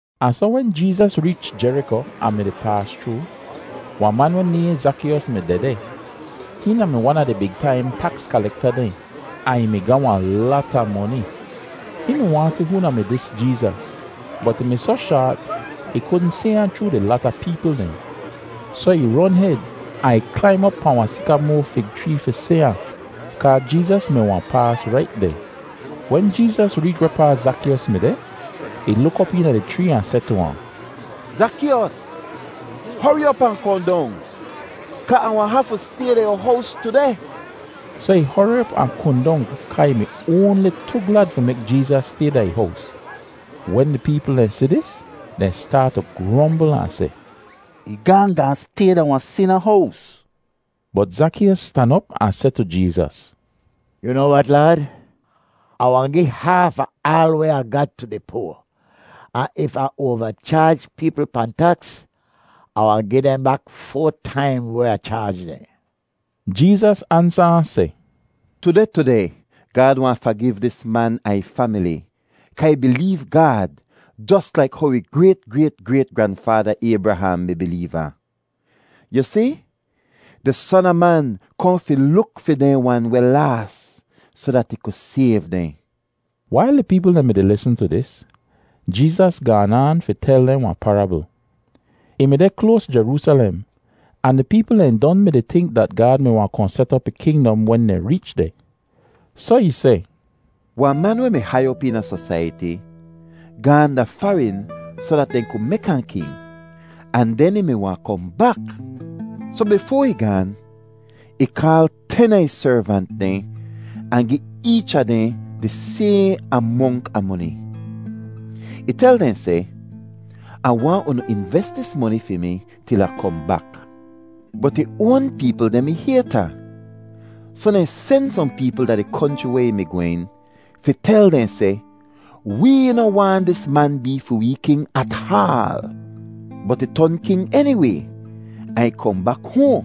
Ahn soh wen Jeezas reech Jeriko ahn mi-di paas chroo, wahn man weh nayhn Zakeeyos mi dehdeh. Hihn da-mi wan a di big taim taks kalekta dehn, ahn ih mi ga wahn lata moni. Hihn mi waahn si hoo da-mi dis Jeezas, bot ih mi soh shaat ih kudn si ahn chroo di lata peepl dehn. Soh ih ron hed ahn ih klaim op pahn wahn sikamoa fig chree fi si ahn kaa Jeezas mi wahn paas rait deh. Wen Jeezas reech wehpaa Zakeeyos mi deh, ih luk op eena di chree ahn seh tu ahn, “Zakeeyos, hori op ahn kohn dong, kaa Ah wahn hafu stay da yu hows tudeh.” Soh ih hori op ahn kohn dong kaa ih mi oanli tu glad fi mek Jeezas stay da ih hows. Wen di peepl dehn si dis, dehn staat tu grombl ahn seh, “Ih gaahn gaahn stay da wahn sina hows!” Bot Zakeeyos stan op ahn seh tu Jeezas, “Yu noa wat, Laad? Ah wahn gi haaf a aal weh Ah ga tu di poa, ahn if Ah oava chaaj peepl pahn taks, Ah wahn gi dehn bak foa taim weh Ah chaaj dehn.” Jeezas ansa ahn seh, “Tudeh tudeh Gaad wahn fagiv dis man ahn ih famili kaa ih bileev Gaad jos laik how ih grayt-grayt-grayt-granfaada Aybraham mi bileev ahn. Yu si, di Son a Man kohn fi luk fi dehn wan weh laas soh dat ih ku sayv dehn.” Wail di peepl dehn mi-di lisn tu dis, Jeezas gaan aan fi tel dehn wahn parabl. Ih mi deh kloas Jeroosalem, ahn di peepl dehn don mi-di tink dat Gaad mi wahn kohn set op ih kingdom wen dehn reech deh. Soh ih seh, “Wahn man weh mi hai op eena sosaiyati gaahn da farin soh dat dehn ku mek ahn king, ahn den ih mi wahn kohn bak. Soh bifoa ih gaan, ih kaal ten a ih servant dehn ahn gi eech a dehn di sayhn amonk a moni. Ih tel dehn seh, ‘Ah waahn unu inves dis moni fi mi til Ah kohn bak.’ Bot ih oan peepl dehn mi hayt ahn, soh dehn sen sohn peepl da di konchri weh ih mi gwehn fi tel dehn seh, ‘Wee noh waahn dis man bee fi wee king ataal!’ “Bot ih ton king eniway ahn ih kohn bak hoahn.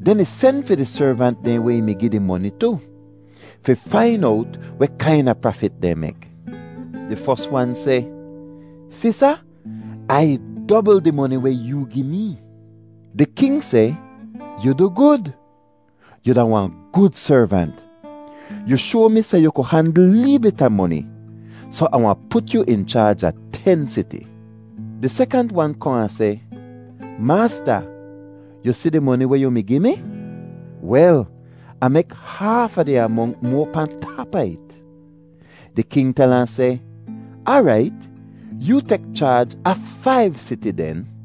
Den ih sen fi di servant dehn weh ih mi gi di moni tu, fi fain owt weh kaina prafit dehn mek. “Di fos wan seh, ‘Si, sa? Ai dobl di moni weh yoo gi mee!’ “Di king seh, ‘Yu du gud! Yu da wahn gud servant! Yu shoa mi seh yu ku handl lee bit a moni, soh Ah wahn put yu in chaaj a ten siti.’ “Di sekant wan kohn ahn seh, ‘Maasta, yu si di moni weh yu mi gi mi? Wel, Ah mek haaf a di amonk moa pahn tap a it!’ “Di king tel ahn seh, ‘Aarait, yoo tek chaaj a faiv siti den.’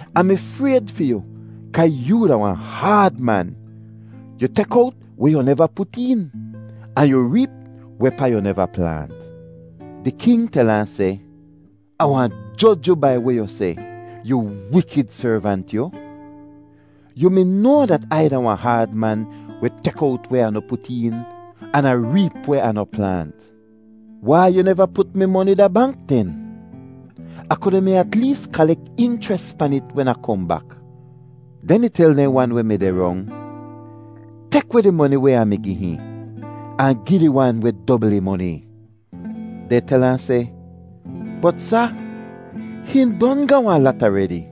Ah mi frayd fi yu kaa yoo da wahn haad man. Yu tek owt weh yu neva put een, ahn yu reep wehpaa yu neva plaant.’ “Di king tel ahn seh, ‘Ah wahn joj yu bai weh yu seh, yu wikid servant yu! Yu mi noa dat Ai da wahn haad man weh tek owt weh Ah noh put een, an Ah reep weh Ah noh plaant. Wai yu neva put mi moni da bank den? Ah kuda mi at lees kalek inchres pan it wen Ah kohn bak.’ Den ih tel dehn wan weh mi deh rong, ‘Tek weh di moni weh Ah mi gi hihn, ahn gi di wan weh dobl ih moni!’ “Dehn tel ahn seh, ‘Bot sa, hihn don ga wahn lat aredi.’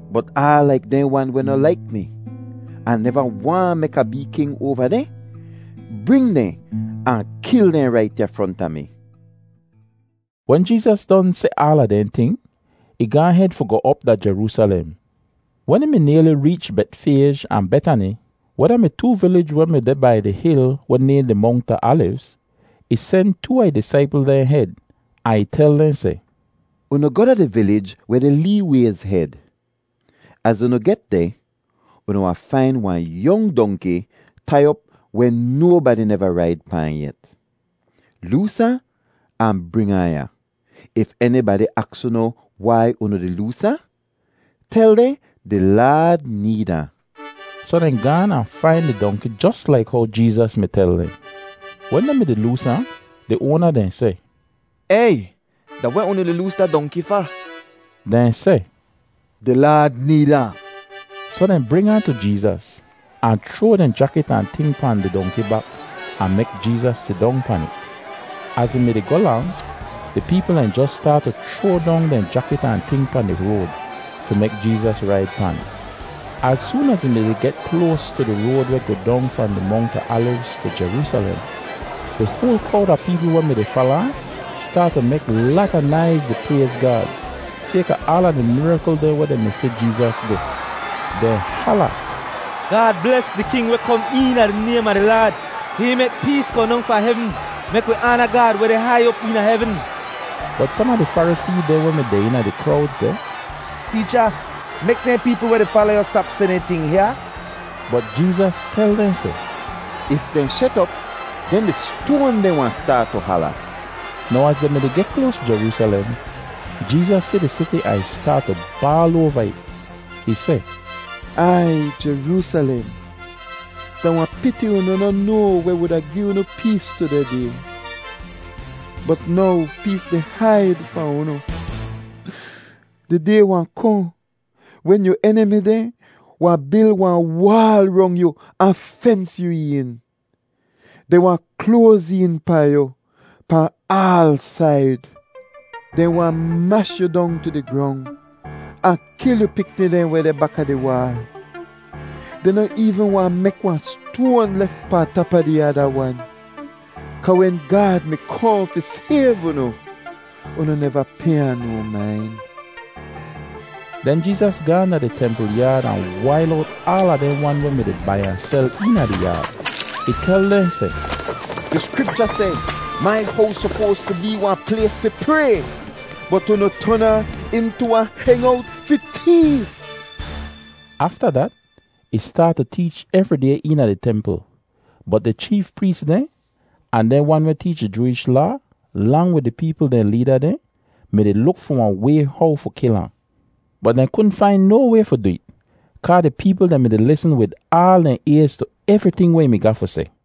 Bot aal laik dehn wan weh noh laik mi, ahn neva waahn mek Ah bee king oava dehn, bring dehn ahn kil dehn rait ya fronta mi.’” Wen Jeezas don seh aala dehn ting, ih gaahn hed fi goh op da Jeroosalem. Wen ih mi nayli reech Betfayj ahn Betani weh da-mi too vilij weh mi deh bai di hil weh nayhn di Mongt a Alivz, ih sen too a ih disaipl dehn hed ahn ih tel dehn seh, “Unu goh da di vilij weh deh lee wayz hed. Az unu get deh, unu wahn fain wahn yong dongki tai op weh nobadi neva raid pahn yet. Loos ahn, ahn bring ahn ya. If enibadi aks unu wai unu di loos ahn, tel dehn di Laad need ahn.” Soh dehn gaan ahn fain di dongki jos laik how Jeezas mi tel dehn. Wen dehn mi-di loos ahn, di oana dehn seh, “Ey! Da weh unu di loos da dongki fa?” Dehn seh, “Di Laad need ahn.” Soh dehn bring ahn tu Jeezas, ahn chroa dehn jakit ahn ting pahn di dongki bak ahn mek Jeezas sidong pan it. Az ih mi-di goh lang, di peepl dehn jos staat tu chroa dong dehn jakit ahn ting pahn di road fi mek Jeezas raid pan. Az soon az ih mi-di geh kloas tu di road weh goh dong fahn di Mongt a Alivz tu Jeroosalem, di hoal krowd a peepl weh mi-di fala ahn staat tu mek lata naiz di prayz Gaad, sayka aala di mirakl dehn weh dehn mi si Jeezas du. Dehn hala: “Gaad bles di king weh kom eena di naym a di Laad.” “Hihn mek pees kohn dong fahn hevn. Mek wi aana Gaad weh deh hai op eena hevn!” Bot som a di Farisee dehn weh mi deh eena di krowd seh, “Teecha, mek dehn peepl weh di fala yu stap seh dehn ting, hyaa!” Bot Jeezas tel dehn seh, “If dehn shet op, den di stoan dehn wahn staat tu hala!” Now az dehn mi-di geh kloas Jeroosalem, Jeezas si di siti ahn ih staat tu baal oava it. Ih seh, “Aiy Jeroosalem, da wahn piti unu noh noa weh wuda gi unu pees tudeh day, bot now pees di haid fahn unu. Di day wahn kohn wen yu enimi dehn wahn bil wahn waal rong yu ahn fens yu een; dehn wahn kloaz een pahn yu pahn aal said. Dehn wahn mash yu dong tu di grong ahn kil yu pikni dehn weh deh baka di waal. Dehn noh eevn wahn mek wan stoan lef pahn tap a di ada wan, kaa wen Gaad mi kohn fi sayv unu, unu neva pay ahn no main.” Den Jeezas gaahn da di templ yaad ahn wail owt aala dehn wan weh mi-di bai ahn sel eena di yaad. Ih tel dehn seh, “Di Skripcha seh, ‘Mai hows sopoas tu bee wahn plays fi pray,’ bot unu ton ahn intu ‘wahn hengowt fi teef.’” Afta dat ih staat tu teech evri day eena di templ, bot di cheef prees dehn, ahn dehn wan weh teech di Jooish Laa, lang wid di peepl dehn leeda dehn mi-di luk fi wahn way how fi kil ahn. Bot dehn kudn fain no way fi du it kaa di peepl dehn mi-di lisn wid aal dehn ayz tu evriting weh ih mi ga fi seh.